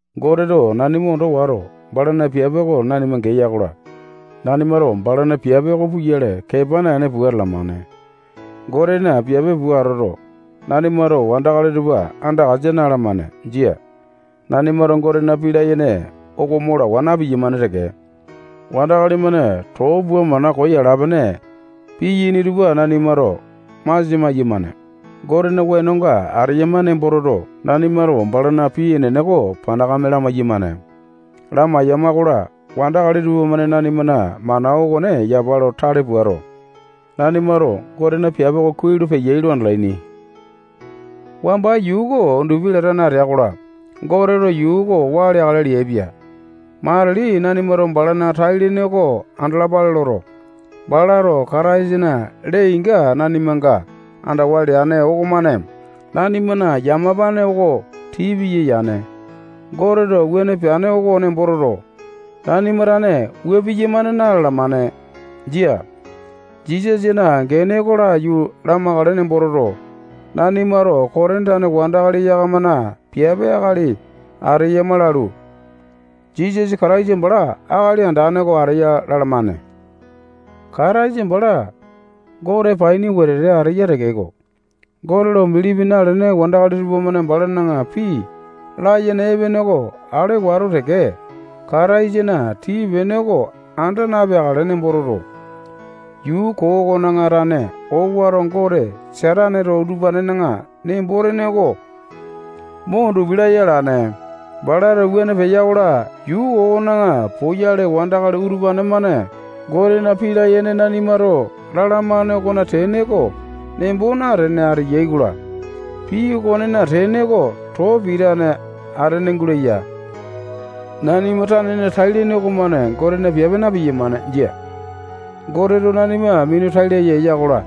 Goteto nanima ondo wato, balana piape oko nanima geya-kola, nanimato balana piape oko puyale, kepa naene, pua atalamane. Gotena piape pua atoto, nanimato wandakali tupa andakasa na-alamane. Jia. Nanimato Gotena pii layene oko mo lawa na-piyamane teke. Wandakali-mane too pua mana koo yala-pene piyaini tupa nanimato masia maiyamane. Gotena wenonga ateyama nembo toto, nanimato balana pii enene oko panakame lamai-yamane. Lamai-yamakola, wandakali tupamane nanimana mana okone yapa lo tale puato, nanimato Gotena piape oko kuai lo peyai lo andalaini. Wamba yuu oko undupi latane atea-kola, Goteto yuu oko waa leakale leaipia. Matili nanimato balana tai-lene oko andalapale loto, balato Kataisana lee-inga nanimanga andawa leane okomane, nanimana yamapane oko tii piya yane. Goteto wuane peane oko nembo toto, nanima tane wua piyamane na-lalamane. Jia. Jisasana gene oko laiyu lamakale nembo toto, nanimato Kotini tane wandakali yakamana piape akali ateyama lalu, Jisasa Kataisa bala Akali Andane oko ateya lalamane. Kataisa bala Gote paini wetete ateya tekeko, Gote lo bilipi nalene wandakali tupamane balana pii layene epene oko ale wato teke, Kataisana tii-pene oko anda napeakale nembo toto, yuu koo okona tane owato gote Sataneto utupanena nembo-tene oko mo undupi laya alane. Balato wuane peya-kola, yuu koo okona poyale wandakali utupane-mane Gotena pii layene nanimato lalamane okona tene oko nembo natene ateyai-kola, pii okonena tene oko too pitane atene guleya. Nanima tanena tai-lene okomane Gotena piape na-piyamane. Jia. Goteto nanima minu tai laya eya-kola,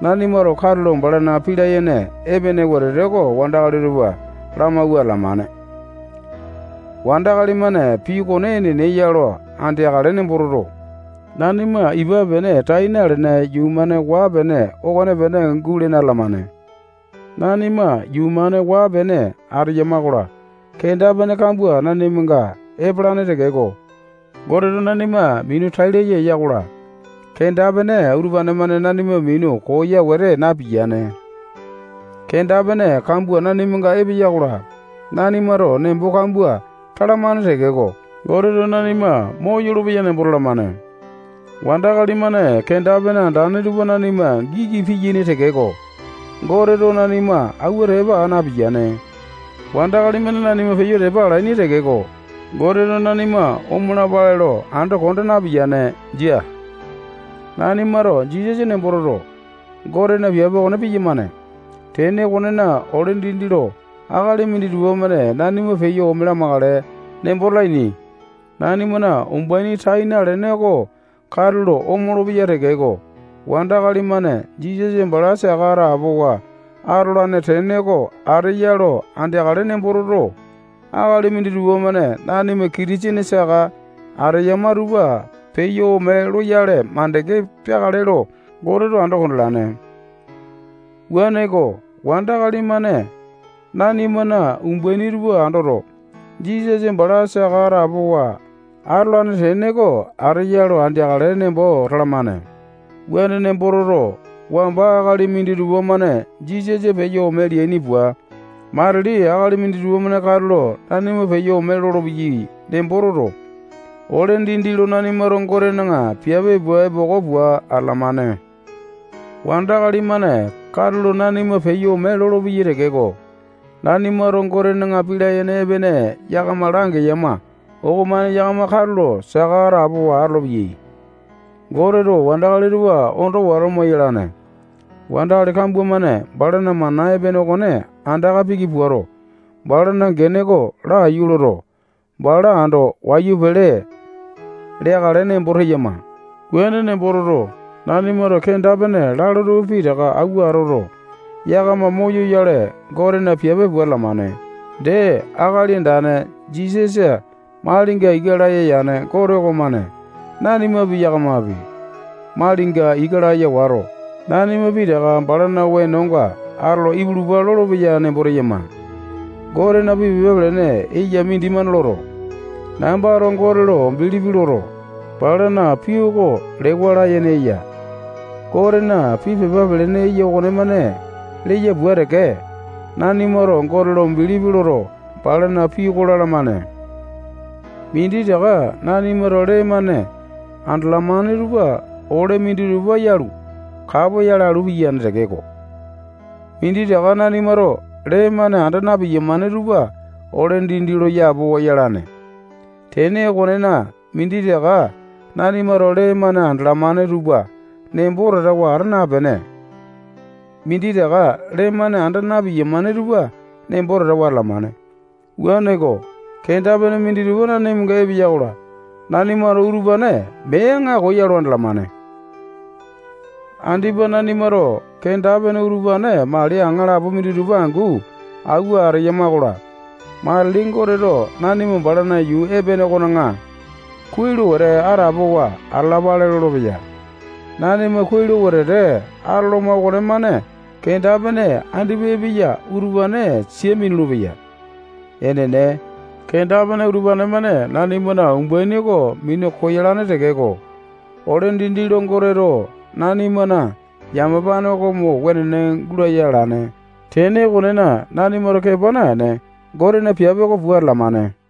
nanimato katulo balana pii layene epene wetete oko wandakali tupa lamawua atalamane. Wandakali-mane pii okone enene ya lo andeakale nembo toto, nanima ipa pene tai nalene yuu-mane waa-pene okonepene gulene atalamane. Nanima yuu-mane waa-pene ateyama-kola, kenda-pene kambua nanimanga epalane tekeko, Goteto nanima minu tai laya eya-kola, kenda-pene utupane-mane nanima minu koya wete napiyane. Kenda-pene kambua nanimanga epeya-kola, nanimato nembo kambua talamane tekeko, Goteto nanima moyolo-peya nembo talamane. Wandakali-mane kenda-pene andane tupa nanima giki piyaini tekeko, Goteto nanima awua tepa aa napiyane. Wandakali-mane nanima peyo tepa alaini tekeko, Goteto nanima omalapale lo ando konda napiyane. Jia. Nanimato Jisasa nembo toto, Gotena piape okone piyamane. Tene okonena, ole dindi lo akali minditupa-mane nanima peyo ome lamakale nembo talaini. Nanimana umbaini tai nalene oko katulo omolo-peya tekeko, wandakali-mane Jisasa bala saka atapowa atolane tene oko ateya lo andeakale nembo toto, akali minditupa-mane nanima Kitisene saka ateyama tupa peyo ome loyale makande peakale lo Goteto ando kondalane. Wuaneko, wandakali-mane nanimana umbaini tupa andoto, Jisasa bala saka atapowa atolane tene oko ateya lo andeakale nembo talamane. Wuane nembo toto, wamba akali minditupa-mane Jisasa peyo ome leaini pua, matili akali minditupa-mane katulo nanima peyo ome lolopeyai nembo toto, ole dindi lo nanimato Gotena piape pua epoko pua atalamane. Wandakali-mane katulo nanima peyo ome lolopeyai tekeko, nanimato Gotena pii layene epene yakama langeyama okomane yakama katulo saka atapowa atolopeyai. Goteto wandakali tupa ondo wato moyalane. Wandakali kambua-mane balana mana epene okone andaka piki puato, balana gene oko laiyu loto, bala ando wayu pele leakale nembo teyama. Wuane nembo toto, nanimato kenda-pene lalo tupa pitaka awua atoto, yakama moyoyale, Gotena piape pua atalamane. Dee, Akali Andane Jisasa malinga ika laya yane Gote okomane nanimapi, yakamapi, malinga ika laya wato, nanima pitaka balana wenonga atolo ipulupa lolopeya nembo teyama. Gotena pii pepa pelene eya mindimane loto, nambato Gote lo bilipi loto, balana pii oko lewa layene eya. Gotena pii pepa pelene eya okonemane leya pua teke, nanimato Gote lo bilipi loto, balana pii oko lalamane. Minditaka nanimato lee-mane andalamane tupa ole minditupa yalu, kapoyale alu piyane tekeko, minditaka nanimato lee-mane anda na-piyamane tupa ole dindi lo yapowa yalane. Tene okonena, minditaka nanimato lee-mane andalamane tupa nembo tatawa ata napene, minditaka lee-mane anda na-piyamane tupa nembo tatawa atalamane. Wuaneko, kenda-pene minditupa nanimanga epeya-kola, nanimato utupane mee aŋako ya lo andalamane. Andipa nanimato kenda-pene utupane mali aŋalapo minditupa angu awua ateyama-kola, matili Goteto nanima balana yuu epene okona kuai lo wetete atapowa atalapale lolopeya. Nanima kuai lo wetete atoloma okonemane kenda-pene andipa epeya utupane sia minulu-peya. Enene, kenda-pene utupane-mane nanimana umbaini oko minu koyalane tekeko, ole dindi lo Goteto nanimana yamapane oko mo wenene gulaya alane. Tene okonena, nanimato kepa naene, Gotena piape oko pua atalamane.